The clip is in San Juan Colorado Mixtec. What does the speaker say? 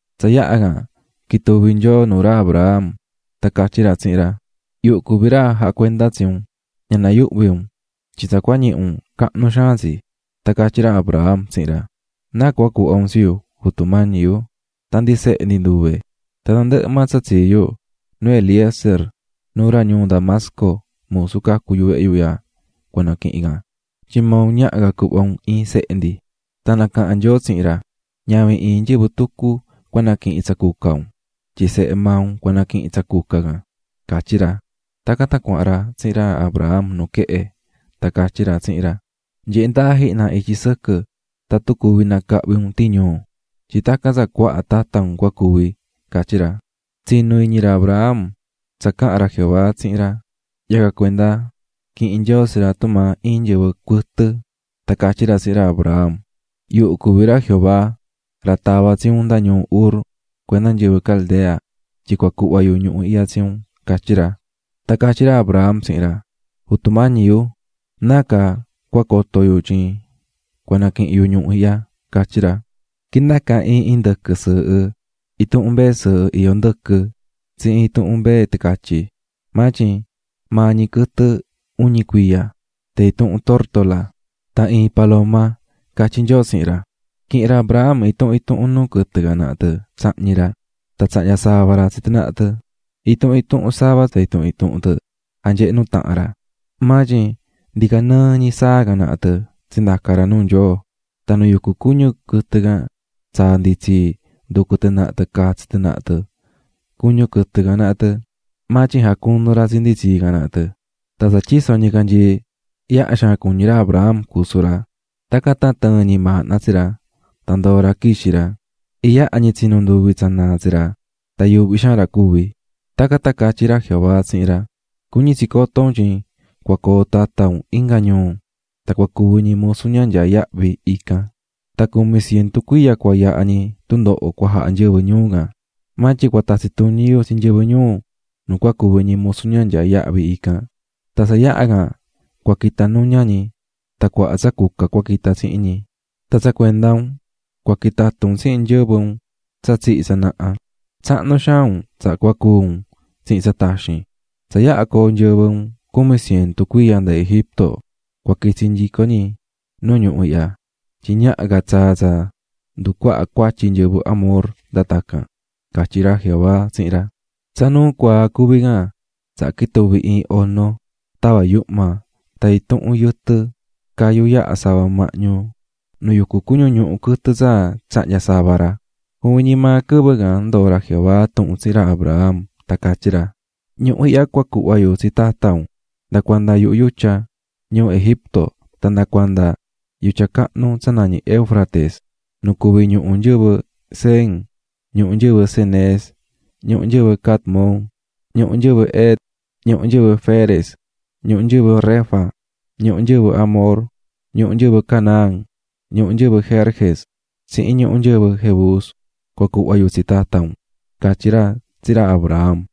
Tsa yaha can quituvi̱ Nyoo nuu ra Abram, tan catyí ra tsihin ra: --Yuhu cuví ra jacuendá tsi un, ña nayuhvi un, tyin tsa cua ñihi un, cahnu xaan tsi. Tan catyí ra Abram tsihin ra: --¿Náa cua cuhva un tsi yu, Jutu Mañi yu? tan ndi sehe ndi nduve. Tan tandɨhɨ maa tsa tsii yu, nu Eliezer, nu ra ñuu Damasco, musu cacu̱ vehe yu ihya, cua naquihin can, tyin maa un ñaha ca cuhva un coo iin sehe ndi. Tan nacaha̱n Nyoo tsihin ra: --Ñavin iin nyɨvɨ tucu cua naquihin tsa cuca iyó tsi un, tyin sehe maa un cua naquihin itsi -catyí ra. Tacan tan cuahan ra tsihin ra Abram nu quehe, tan catyí ra tsihin ra: --Nye̱he ndaa jihna ityi sɨquɨ tatun cuvi nacahvi un tiñuu, tyin tacan tsa cuaha tata un cua cuvi --catyí ra. Tsinu̱ iñi ra Abram tsa caha̱n ra Jehová tsihin ra, yacan cuenda quihi̱n Nyoo tsi ra tumaa iin nyɨvɨ cuɨtɨ. Tan catyí ra tsihin ra Abram: --Yuhu cuví ra Jehová, ra tava̱ tsi un nda ñuu Ur cuenda nyɨvɨ Caldea tyin cua cuhva yu ñuhu ihya tsi un --catyí ra. Tan catyí ra Abram tsihin ra: --Jutu mañi yu, ¿Nácaa cua coto yu tyin cua naquihin yu ñuhu ihya? --catyí ra. --Qui̱ndaca iin indɨquɨ sɨɨhɨ, intuhun mbee sɨɨhɨ iyó ndɨquɨ tsihin intuhun mbee ticatyi, maa tyin maa ñi quɨtɨ uñi cuiya, tan intuhun curuu tan iin paloma ―catyí Nyoo tsihin ra. Quihi̱n ra Abram intuhun intuhun nuu quɨtɨ can naha tɨ tsahñi̱ ra, tan tsahnya̱ sava ra tsi tɨ naha tɨ. Intuhun intuhun sava tsa intuhun intuhun tɨ janyehe̱ nutahan ra, maa tyin curuu tan paloma ndicanɨɨ tɨ naha tɨ tsindaca̱ ra nuu Nyoo. Tan nu yucú cuñu quɨtɨ can, tsaa̱ nditsii nducú tɨ naha tɨ catsi tɨ naha tɨ cuñu quɨtɨ can naha tɨ, maa tyin jacunu̱ ra tsi nditsii can naha tɨ. Tan tsa tyiso̱ ñicanyii, yaha xaan cuñí ra Abram cusu ra, tacan tan tɨɨ̱n ñimaahna tsi ra tan ndoo̱ ra quixi̱ ra. Iyaha ñi tsinu̱ nduvi tsa naa tsi ra tan yuuhví xaan ra cuvi̱. Tacan tan catyí ra Jehová tsihin ra: --Cuñí tsi cotó un tyin cua coo tata un inga ñuu tan cua cuvi ñi musu ña nyaa yahvi ican, tan cumi cientu cuiya cua yaha ñi tundoho cua jaha nyɨvɨ ñuu can. Maa tyin cua tatsi tuñi yu tsi nyɨvɨ ñuu nu cua cuvi ñi musu ña nyaa yahvi, tan tsa yaha can cua quita nuña ñi tan cuaha tsa cuca cua quihin ñi cuhun tsihin ñi. Tan tsa cuenda un, cua quitatu un tsihin nyɨvɨ un tsa tsihi̱ tsanaha, tsahnu xaan un tsaha cua cúu un. Tsa yaha coo nyɨvɨ un cumi cientu cuiya nda Egipto, cua quitsi nyico ñi nu ñuhu ihya, tyin ñaha ca tsaa tsa nducuaha cuatyi nyɨvɨ Amor nda tacan --catyí ra Jehová tsihin ra. Tsa nuu cuaa cuví can, tsaha quituvi̱ iin ono tava̱ yuhma tan intuhun yɨtɨ cayú yaha̱ sava mahñu nu yucú cuñu ñuhu quɨtɨ tsa tsahnya̱ sava ra. Juvin ñi maa quɨvɨ can ndoo̱ ra Jehová tuhun tsihin ra Abram, tan catyí ra: --Ñuhu ihya cua cuhva yu tsi tata un, nda cuenda yuhu yutya ñuu Egipto tan nda cuanda yutya cahnu, tsa nañí Éufrates: nu cuví ñuhu nyɨvɨ Cen, ñuhu nyɨvɨ Cenez, ñuhu nyɨvɨ Cadmon, ñuhu nyɨvɨ Het, ñuhu nyɨvɨ Ferez, ñuhu nyɨvɨ Refa, ñuhu nyɨvɨ Amor, ñuhu nyɨvɨ Canaán, ñuhu nyɨvɨ Gerges, tsihin ñuhu nyɨvɨ Jebus, cua cuhva yu tsi tata un --catyí ra tsihin ra Abram.